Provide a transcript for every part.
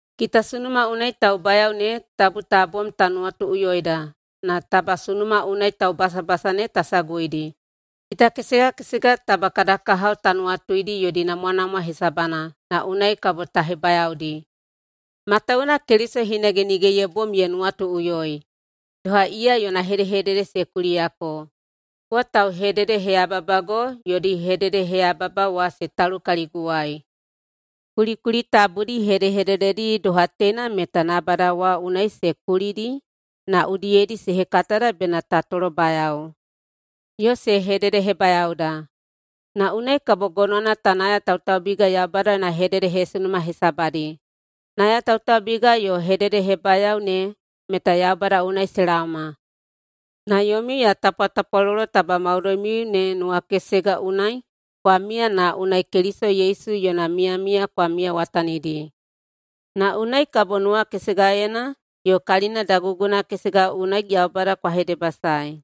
Kita sunuma unai taubayao ne tabu ta bom mo ta nuwatuꞌuyoida na taba sunuma unai taubasabasa ne ta saguidi. Kita kesega kesega taba kada kahao ta nuwatuidi yodi namwanamwa hesabana na unai kabo ta hebayaodi. Matawuwuna Keliso hinage nige ye bom ye nuwatuꞌuyoi, doha iya yona hedehedede se kuliyako, “Kowa tauhededeheyababago yodi hededeheyababa wa se talu kaliguwai.” Kulikuli tabudi hedehedededi doha teina meta nabada wa unai se kulidi na udiyedi se hekatada bena ta tolobayao, yo se hededehebayaoda. Na unai kabo gonowana ta nayatautaubiga Yaubada yona hededehesunuma hesabadi. Nayatautaubiga yo hededehebayao ne meta Yaubada unai se laoma. Na yomiu ya tapwatapwalolo taba maudoimiu ne nuwakesega unai kwa miya na unai Keliso Yesu yona miyamiya kwa miyawatanidi. Na unai kabo nuwakesegaena yo kalina daguguna kesega unai Yaubada kwa hedebasaei,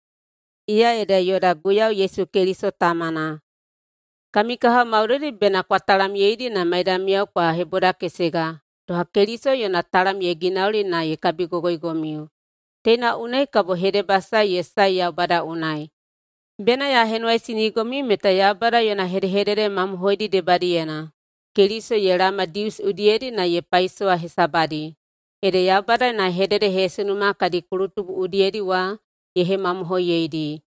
iya ede yoda Guiyau Yesu Keliso Tamana. Kami kahao maudoidi bena kwa talamyeidi na maidamiyao kwa hebodakesega, doha Keliso yona talam ye ginauli na ye kabigogoigomiu. Teina unai kabo hedebasae ye sae Yaubada unai. Bena ya henuwaisinigomiu meta Yaubada yona hedehedede mamohoidi debadiyena Keliso ye laoma Dius udiyedi na ye paisowa hesabadi. Ede Yaubada yona hededehesunuma kadi kulutubu udiyedi wa ye hemamohoiyeidi,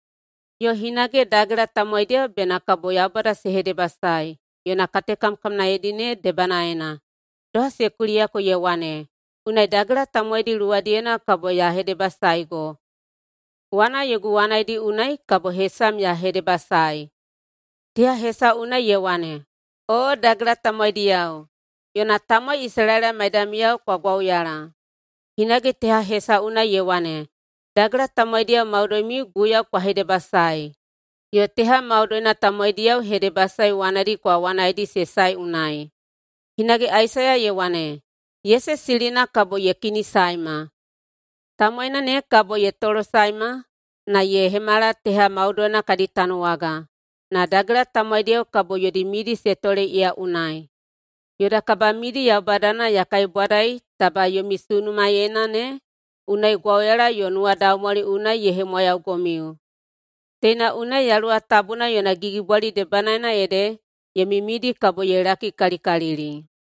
yo hinage dagela tamowaidiyao bena kabo Yaubada se hedebasaei yona katekamkamnaedi ne debanaena. Doha se kuliyako ye wane, “Unai dagela tamowaidi luwadiyena kabo ya hedebasaego, wana yogu wanaidi unai kabo hesam ya hedebasaei.” Teha hesau unai ye wane, “Oo, dagela tamowaidiyao, yona tamowai Isalaela maidamiyao kwa gwauyala!” Hinage teha hesau unai ye wane, “Dagela tamowaidiyao maudoimiu, Guiyau kwa hedebasaei, yo teha maudoina tamowaidiyao, hedebasae wanadi kwa wanaeidi se sae unai.” Hinage Aisaiya ye wane, “Yese silina kabo ye kinisaema. Tamowaina ne kabo ye tolosaema na ye hemala teha maudoina kadi tanuwaga. Na dagela tamowaidiyao kabo yodi midi se tole iya unai.” Yoda kabamidi Yaubadana ya kaibwadaei taba yomi sunumaeina ne unai gwauyala yo nuwadaumwali unai ye hemwayaugomiu. Teina unai Yaluwa Tabuna yona gigibwali debanaena ede yomi midi kabo ye lakikalikalili.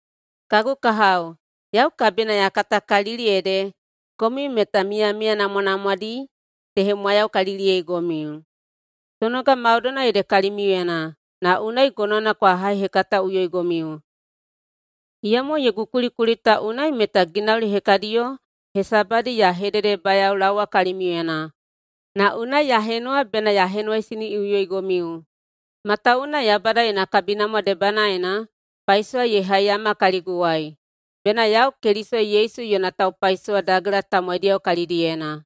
Kagu kahao, yau kabina ya katakalili ede komiu meta miyamiya namwanamwadi se hemwayaukaliliyeigomiu. Sonoga maudoina ede kalimiuyena na unai gonowana kwa haihekataꞌuyoigomiu. Iyamo yogu kulikuli ta unai meta ginauli hekadiyo hesabadi ya hededebayaolaowa kalimiuyena, na unai ya henuwa bena ya henuwaisiniꞌuyoigomiu, matawuwuna Yaubada yona kabinamwa debanaena paisowa ye haiyama kaliguwai bena yau Keliso Yesu yona taupaisowa dagela tamowaidi kalidiyena.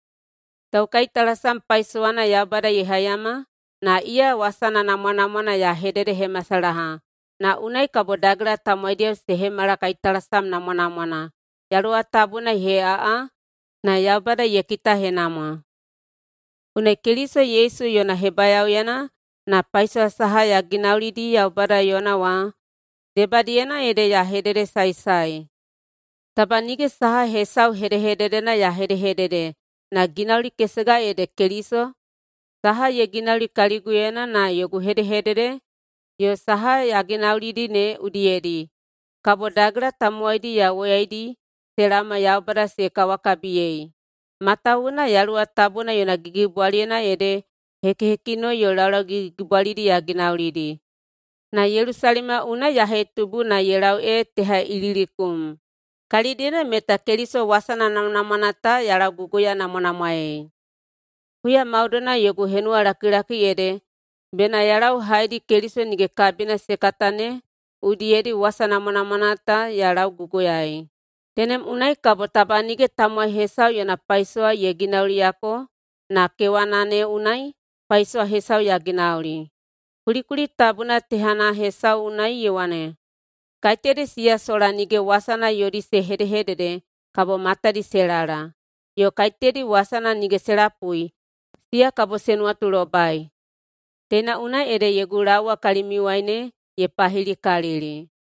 Taukaitalasam paisowana Yaubada ye haiyama na iya wasana namwanamwana ya hededehemasalaha, na unai kabo dagela tamowaidiyao se hemala kaitalasam namwanamwana, Yaluwa Tabuna ye heꞌaꞌa na Yaubada ye kitahenamwa. Unai Keliso Yesu yona hebayaoyena na paisowa saha ya ginaulidi Yaubada yona wa debadiyena ede ya hededesaesae. Taba nige saha hesau hedehededena ya hedehedede na ginauli kesega ede Keliso saha ye ginauli kaliguyena na yogu hedehedede yo saha ya ginaulidi ne udiyedi kabo dagela tamowaidi ya woyaidi se laoma Yaubada se kawakabiyei. Matawuwuna Yaluwa Tabuna yona gigibwaliyena ede hekihekinoi yo laulau gigigigibwalidi ya ginaulidi. Na Yelusalema unai ya hetubu na ye lau ee teha Ililikum, kalidiyena meta Keliso wasana namwanamwana ta ya lauguguyanamwanamwaei. Huya maudoina yogu henuwalakilaki ede bena ya lau haedi Keliso nige kabina se kata ne udiyedi na wasa namwanamwana ta ya lauguguyaei. Tenem unai kabo taba nige tamowai hesau yona paisowa ye ginauliyako na kewana ne unai paisowa hesau ya ginauli. Kulikuli tabuna tehana hesau unai ye wane, “Kaiteyadi siya sola nige wasana yodi se hedehedede kabo matadi se lala, yo kaiteyadi wasana nige se lapui, siya kabo se nuwatulobai.” Teina unai ede yogu laowa kalimiuwai ne ye pahilikalili.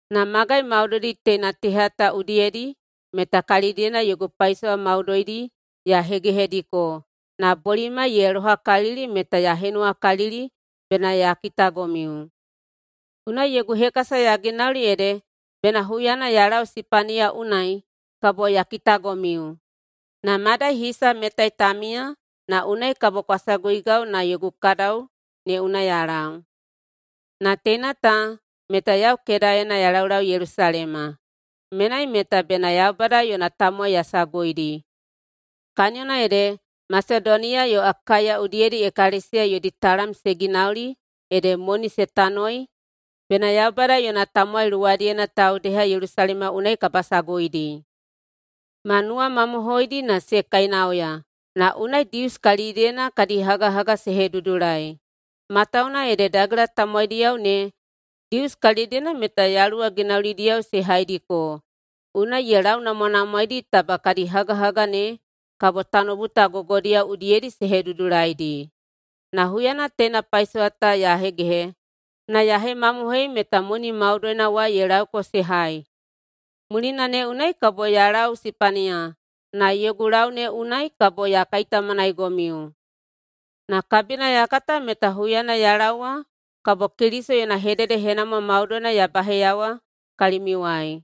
Na magai maudoidi teina teha ta udiyedi meta kalidiyena yogu paisowa maudoidi ya hegehediko na bolimai ye lohakalili meta ya henuwakalili bena ya kitagomiu. Unai yogu hekasa ya ginauli ede bena huyana ya lau Sipaniya unai kabo ya kitagomiu. Na mayadai hisa metai ta miya na unai kabo kwa saguigau na yogu kadau ne unai ya lau. Na teina ta meta yau kedaena ya laulau Yelusalema. Menai meta bena Yaubada yona tamowai ya saguidi. Kaniyona ede Masedoniya yo Akaiya udiyedi ekalesiya yodi talam se ginauli ede moni se tanoi bena Yaubada yona tamowai luwadiyena taudeha Yelusalema unai kabasaguidi. Ma nuwamamohoidi na se kainauya, na unai Dius kalidiyena kadi hagahaga se hedudulai. Matawuwuna ede dagela tamowaidiyao ne Dius kalidiyena meta Yaluwa ginaulidiyao se haidiko, unai ye launamwanamwaedi taba kadi hagahaga ne kabo tanoubu ta gogodiyao udiyedi se hedudulaidi. Na huyana teina paisowa ta ya hegehe na ya hemamohoiyei meta moni maudoina wa ye lauko se hai, mulina ne unai kabo ya lau Sipaniya na yogu lau ne unai kabo ya kaitaumanaigomiu. Na kabina ya kata meta huyana ya laowa kabo Keliso yona hededehenamwa maudoina ya baheiyawa kalimiuwai.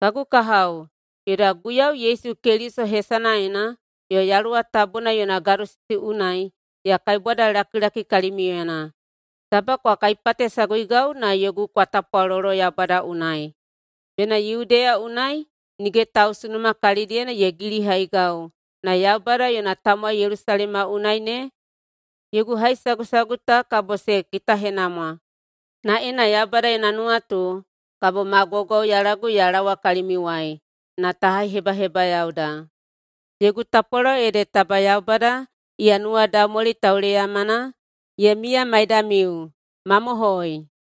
Kagu kahao, yoda Guiyau Yesu Keliso hesanaena yo Yaluwa Tabuna yona gadosisi unai ya kaibwadalakilaki kalimiuyena taba kwa kaipatesaguigau na yogu kwa tapwalolo Yaubada unai bena Yudeya unai nige tausunuma kalidiyena ye gilihaigau na Yaubada yona tamowai Yelusalema unai ne yogu haisagusagu ta kabo se kitahenamwa. Na ena Yaubada yona nuwatu, kabo ma gwaugwauyalagu ya laowa kalimiuwai na ta haihebahebayaoda. Yogu tapwalolo ede taba Yaubada, iya nuwadaumwali tauleyamana, ye miya maidamiu. Mamohoi!